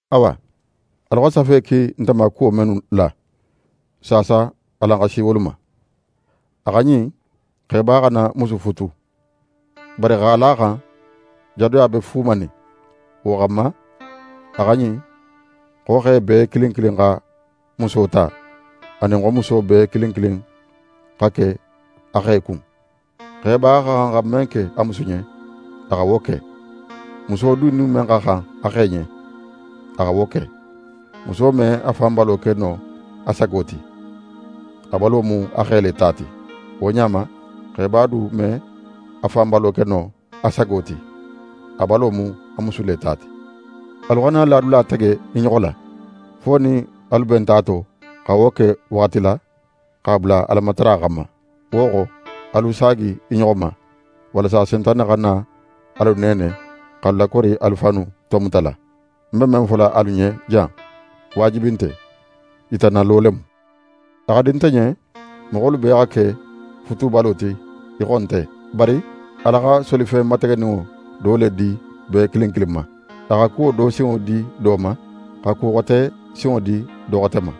Awa, alu xa safe ki nte ma kuwo mennu la, saasa alan xa si wolu ma. A xa ɲin, xeba xana musu futu. Bari x'a la a xan jadoya be fuumanin; wo xanma, a xa ɲin xo xe bee kilin kilin xa muso ta, anin xo muso bee kilin kin xa ke a xe kun. Xeba xa xan xa men ke a musu ɲen, a xa wo ke; muso du nin men xa xan a xe ɲen, a xa wo ke. Muso me a fan balo ke no a sago ti; a balo mu a xe le ta ti. Wo ɲa ma, xeba du me a fan balo ke no a sago ti; a balo mu a musu le ta ti. Alu xana ladula tege i ɲoxo la, fo nin alu benta a to, xa wo ke waxati la, x'a bula Alamatara xanma. Wo xo, alu saagi i ɲoxo ma, walasa Sentane xana alu neene, x'alu lakori alu fannu tomutala. Ń be men fola alu ɲen jan, waajibi nte; yitannalo le mu. A xa di nte ɲen moxolu bee xa ke futubalo ti í xo nte; bari Ala xa solifen mategeninŋo do le di bee kilin kilin ma. A xa kuwo do sinŋo di do ma, xa ku xote sinŋo di do xote ma.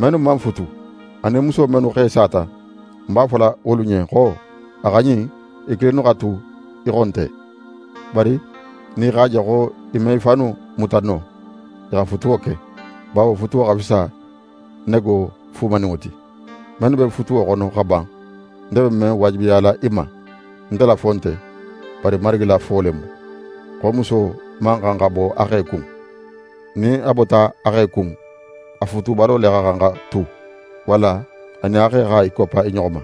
Mennu man futu, anin muso mennu xe sata, ń b'a fola wolu ɲen xo a xa ɲin i kilinnu xa tu í xo nte. Bari nin i x'a je xo i me i fannu muta no, i xa futuwo ke. Bawo futuwo xa fisa nego fuumaninŋo ti. Mennu be futuwo xono xa ban, nte be men waajibiyala i ma, nte la fo nte, bari Marigi la fo le mu, xo muso man xan xa bo a xe kun. Nin a bota a xe kun, a futubalo le xa xan xa tu, walla a nin a xe xa i koppa i ɲoxo ma.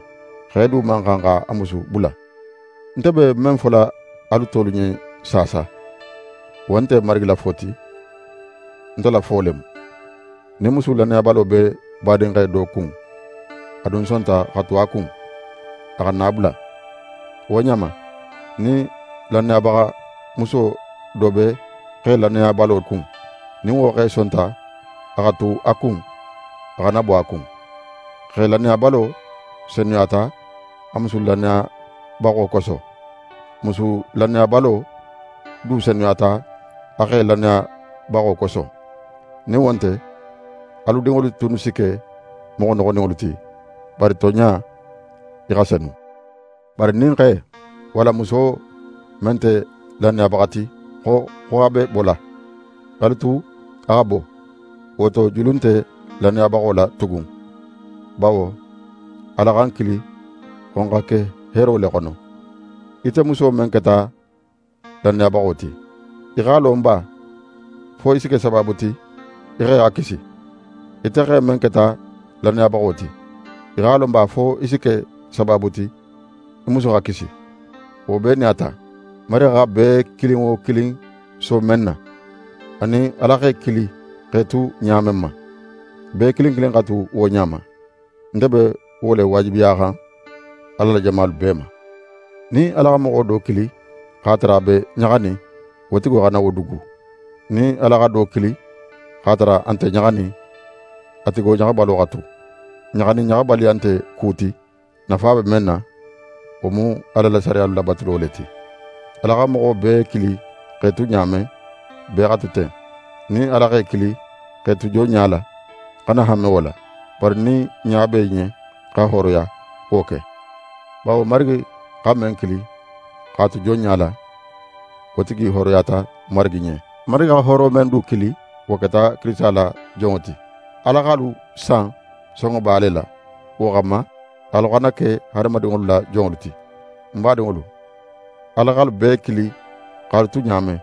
Xe du man xan x'a musu bula. Nte be men fola alu tolu ɲen saasa, wo nte Marigi la fo ti, nte la fo le mu: Nin musu lannayabalo be badinxe do kun, a dun sonta xa tu a kun, a xana a bula. Wo ɲa ma, nin lannayabaxa muso do be xe lannayabalo kun, nin wo xe sonta a xa tu a kun, a xana bo a kun. Xe lannayabalo senuyata a musu lannayabaxo koso. Musu lannayabalo du senuyata a xe lannayabaxo koso. Nin wo nte, alu dinŋolu tunnu si ke moxo noxoninŋolu ti, bari tonɲa, i xa senu. Bari nin xe, walla muso men nte lannayabaxa ti xo, xo a be bola, alu a tu a xa bo. Wo to, julu nte lannayabaxo la tugun; bawo Ala xa n kili xo n xa ke heero le xono. Ite muso men keta lannayabaxo ti, í x'a lon ba fo í si ke sabaabu ti í xe xa kisi? Ite xe men keta lannayabaxo ti, í x'a lon ba fo í si ke sabaabu ti í musu xa kisi? Wo bee nin a ta, Marigi xa bee kilin wo kilin so men na, anin Ala x'é kili x'é tu ɲa men ma, bee kilin kilin xa tu wo ɲa ma. Nte be wo le lawaajibiyaxan Ala la jamalu bee ma. Nin Ala xa moxo do kili x'a tara a be ɲaxanin, wo tigi xana wo dugu. Nin Ala xa do kili x'a tara a nte ɲaxanin, a tigo ɲaxabalo xa tu. Ɲaxa nin ɲaxabaliya nte ku ti; nafa be men na, wo mu Ala la sariyalu labatulo le ti. Ala xa moxo bee kili x'é tu ɲa men, bee xa tu ten. Nin Ala x'é kili x'é tu jonɲa la, xana hanme wo la. Bari nin ɲa be í ɲen xa hooroya, wo ke. Bawo Marigi xa men kili x'a tu jonɲa la, wo tigi hooroyata Marigi ɲen. Marigi xa hooro men du kili, wo keta Kirisita la jonŋo ti. Ala x'alu san sonŋoba le la, wo xanma, alu xana ke hadamadinŋolu la jonŋolu ti. Ń badinŋolu, Ala x'alu bee kili x'alu tu ɲa men,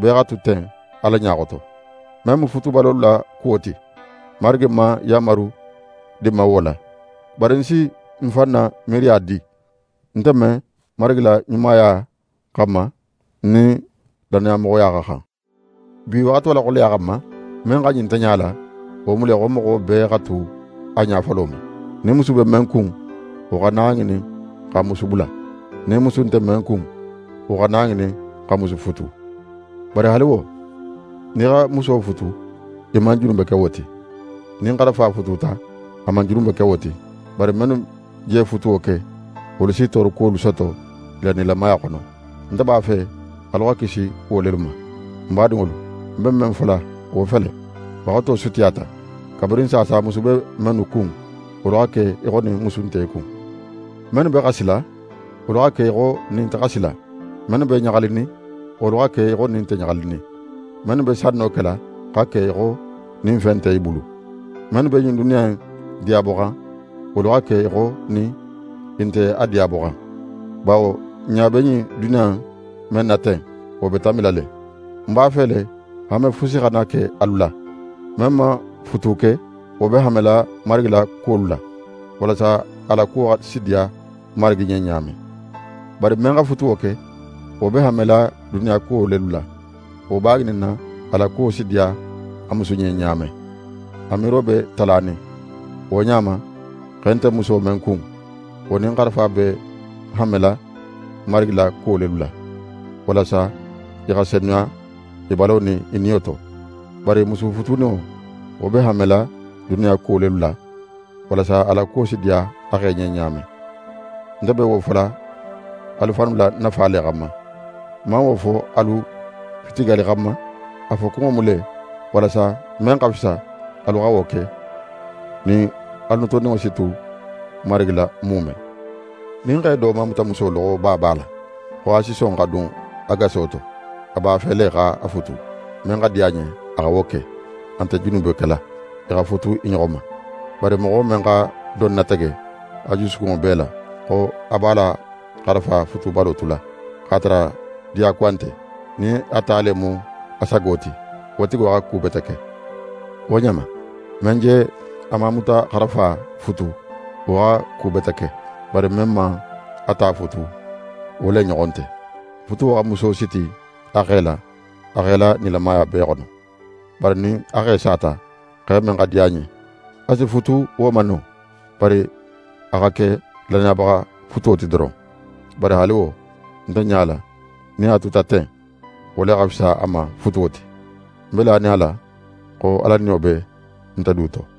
bee xa tu ten Ala ɲa xoto. Men mu futubalolu la kuwo ti, Marigi man yanmaru di ń ma wo la; bari ń si ń fan na miiriya di, nte men, Marigi la ɲumaya xanma, ń nin lannamoxoya xa xan. Bi waxato la xoleya xanma, men xa ɲin nte ɲala, wo mu le xo moxo bee xa tu a ɲa folo ma. Nin musu be men kun, wo xana a ŋinin x'a musu bula. Nin musu nte men kun, wo xana a ŋinin xa musu futu. Bari haali wo, nin í xa muso futu, í man junube ke wo ti. Nin xarafa fututa, a man junube ke wo ti. Bari mennu je futuwo ke, wolu si toorokuwolu soto i la nilamaya xono. Nte b'a fe alu xa kisi wo lelu ma. Ń badinŋolu, ń be men fola wo fele: Waxato sutiyata. Kabirin saasa musu be mennu kun, wolu xa ke í xo nin musu nte i kun. Mennu be xasila, wolu xa ke í xo nin i nte xasila. Mennu be ɲaxalinin, wolu xa ke í xo nin i nte ɲaxalinin. Mennu be sanno kela, xa ke í xo nin fen nte i bulu. Mennu be ɲin duniya in diyaboxan, wolu xa ke í xo nin i nte a diyaboxan; bawo n ɲa be ɲin duniya in men na ten, wo be tanbila le. Ń b'a fe le, hanme fusi xana ke alu la. Men man futu ke, wo be hanmela Marigi la kuwolu la, walasa a la kuwo si diya Marigi ɲen ɲa men. Bari men xa futuwo ke, wo be hanmela duniya kuwo lelu la. Wo b'a ŋininna, a la kuwo si diya a musu ɲen ɲa men. A miiro be talanin. Wo ɲa ma, xe nte muso men kun, wo nin xarafa be hanmela Marigi la kuwo lelu la, walasa i xa senuya i balo nin i niyo to. Bari musu futuninŋo, wo be hanmela duniya kuwo lelu la; walasa a la kuwo si diya a xe ɲen ɲa men. Nte be wo fola alu fannu la nafa le xanma. Ń man wo fo alu fitigali xanma; a fokunŋo mu le, walasa men xa fisa, alu xa wo ke; nin alu notoninŋo si tu Marigi la muume. Nin xe do mamutamuso loxoba b'a la, xo a si son xa dun a gaso to, a b'a fe le x'a futu. Men xa di a ɲen a xa wo ke. A nte junube kela, i xa futu i ɲoxo ma. Bari moxo men xa don natege a jusukunŋo bee la, xo a b'a la xarafa futubalo tula, x'a tara diyakuwa nte, nin a ta le mu a sago ti, wo tigo xa ku bete ke. Wo ɲa ma, men je a mamutaxarafa futu, wo xa ku bete ke; bari men man a ta futu, wo le ɲoxon nte. Futuwo xa muso siti a xe la, a xe la nilamaya bee xono; bari nin a xe sata, xe men xa di a ɲen, a si futu wo ma no. Bari a xa ke lannayabaxa futuwo ti doron. Bari haali wo, nte ɲala nin a tuta ten, wo le xa fisa a ma futuwo ti. Ń be lanin a la xo Ala Niyo be nte du to.